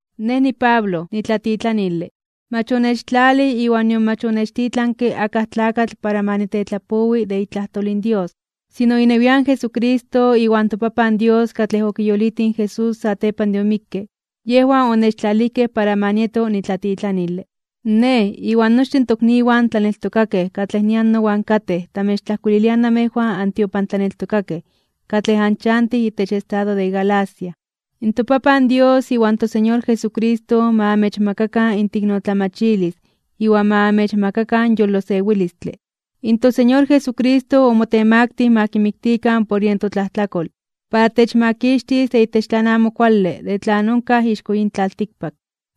Nej niPablo, nitlatitlanile. Mach onechtlalij iwan nion mach onechtitlanke akaj tlakatl para ma nitetlapowi de itlajtol in Dios, sino inewian Jesucristo iwan toPapan Dios katlej okiyolitij in Jesús satepan de omikke, yejwan onechtlalijkej para ma nieto nitlatitlanile. Nej, iwan nochtin tokniwan tlaneltokakej katlej nian nowan katej, tamechtlajkuililiaj namejwan antiopantlaneltokakej katlej anchantij itech estado de Galacia. ToPapan Dios iwan toSeñor Jesucristo ma amechmakakan inteiknotlamachilis iwan ma amechmakakan yolosewilistle. In toSeñor Jesucristo omotemaktij (omotemaktilij) ma kimiktikan por yen totlajtlakol, para techmakixtis de itech tlan amo kuale de tlan onkaj ixko yin tlaltikpak,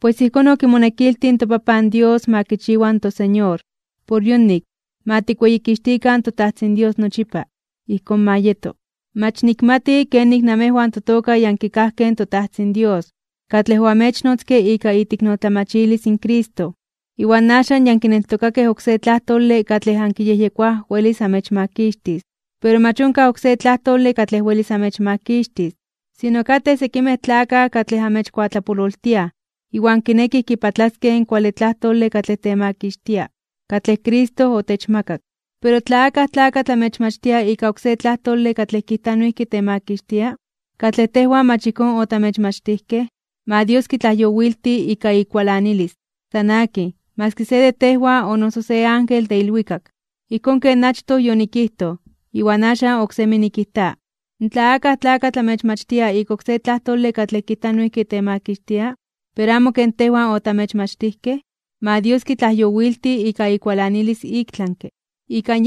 pues ijkón okimonekiltij in toPapan Dios ma kichiwa in toSeñor. Por yonik, ma tikweyikixtikan toTajtzin Dios nochipa. Ijkón ma yeto. Mach nikmati kenik namejwan totoka ya ankikajkej in toTajtzin Dios, katlej oamechnotzke ika iteiknotlamachilis in Cristo. Iwan axan ya ankineltokaj oksé tlajtole katlej ankiyejyekoaj welis amechmakixtis. Pero mach onkaj oksé tlajtole katlej welis amechmakixtis. Sino katej sekimej tlakaj katlej amechkuatlapololtiaj, iwan kinekij kipatlaskej in kuale tlajtole katlej temakixtia, katlej Cristo otechmakak. Pero tla akaj tlakatl amechmachtia ika oksé tlajtole katlej kijta noijki temakixtia, katlej tejwan mach ijkón otamechmachtijkej, ma Dios kitlajyowilti ika ikualanilis. San akin, maski se de tejwan o noso se ángel de ilwikak. Ijkón ken achtoj yonikijtoj, iwan axan oksemi nikijta: Tla akaj tlakatl amechmachtia ika oksé tlajtole katlej kijta noijki temakixtia, pero amo ken tejwan otamechmachtijkej, ma Dios kitlajyowilti ika ikualanilis iktlanke (ik tlami).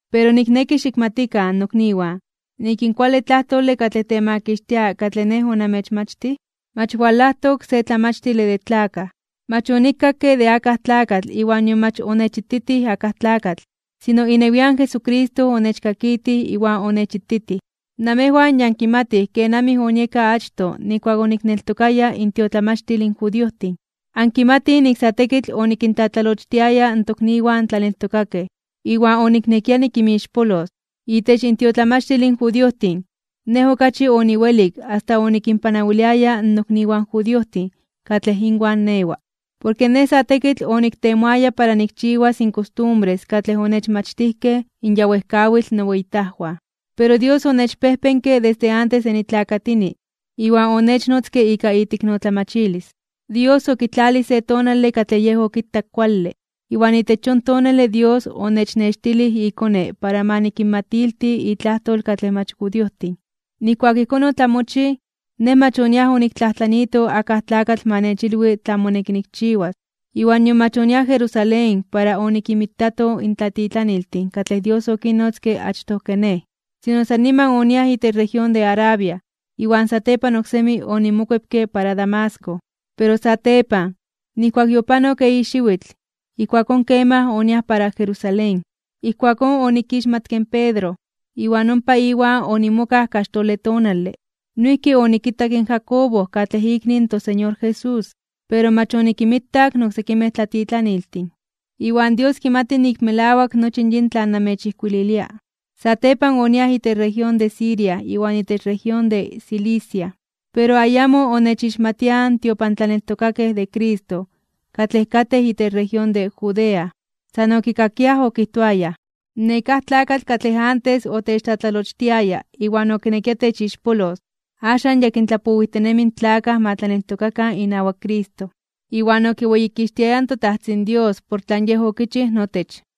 Pero nikneki xikmatikan, nokniwan, nik in kuale tlajtole katlej temakixtia katlej nej onamechmachtij, mach walajtok se tlamachtile de tlakaj. Mach onikakke de akaj tlakatl iwan nion mach onechititij akaj tlakatl, sino inewian Jesucristo onechkakitij iwan onechititij. Namejwan ya ankimatij kenamij onieka achtoj nijkuak onikneltokaya intiotlamachtil in judiojtin. Ankimatij nik sa tekitl onikintlatlalochtiaya in tokniwan tlaneltokakej, iwan oniknekia nikinmixpolos. Itech intiotlamachtil in judiojtin, nej okachi oniwelik asta onikinpanawiliaya in nokniwan judiojtin katlej inwan newa, porke nej sa tekitl onimotemaktiaya para nikchiwas in kostumbres katlej onechmachtijkej in ya wejkawitl noweyitajwan. Pero Dios onechpejpenke desde antes de nitlakatini, iwan onechnotzke ika iteiknotlamachilis. Dios okitlalij se tonale katlej Yej okitak kuale, iwan itech yon tonale Dios onechnextilij iKone para ma nikinmatilti itlajtol katlej mach judiojtin. Nijkuak ijkón otlamochij, nej mach oniaj oniktlajtlaniito akaj tlakatl ma nechilwi tlan moneki nikchiwas. Iwan nion mach oniaj Jerusalén para onikinmitato in tlatitlaniltin katlej Dios okinnotzke achtoj ke nej. Sino san niman oniaj itech región de Arabia, iwan satepan oksemi onimokuepke para Damasco. Pero satepan, nijkuak yopanok eyi xiwitl, ijkuakón kemaj oniaj para Jerusalén. Ijkuakón onikixmatke in Pedro, iwan ompa iwan onimokaj kaxtole tonale. Noijki onikitak in Jacobo katlej ikni in toSeñor Jesús, pero mach onikinmitak in oksekimej tlatitlaniltin. Iwan Dios kimati nik melawak nochi yin tlan namechijkuililia. Satepan oniaj itech región de Siria iwan itech región de Cilicia. Pero ayamo onechixmatiaj in tiopantlaneltokakej de Cristo katlej katej itech región de Judea. San okikakiaj okijtoayaj: “Nekáj tlakatl katlej antes otechtlatlalochtiaya iwan okinekia techixpolos, axan ya kintlapowijtinemi in tlakaj ma tlaneltokakan inawak Cristo.” Iwan okiweyikixtiayaj in toTajtzin Dios por tlan Yej okichij notech.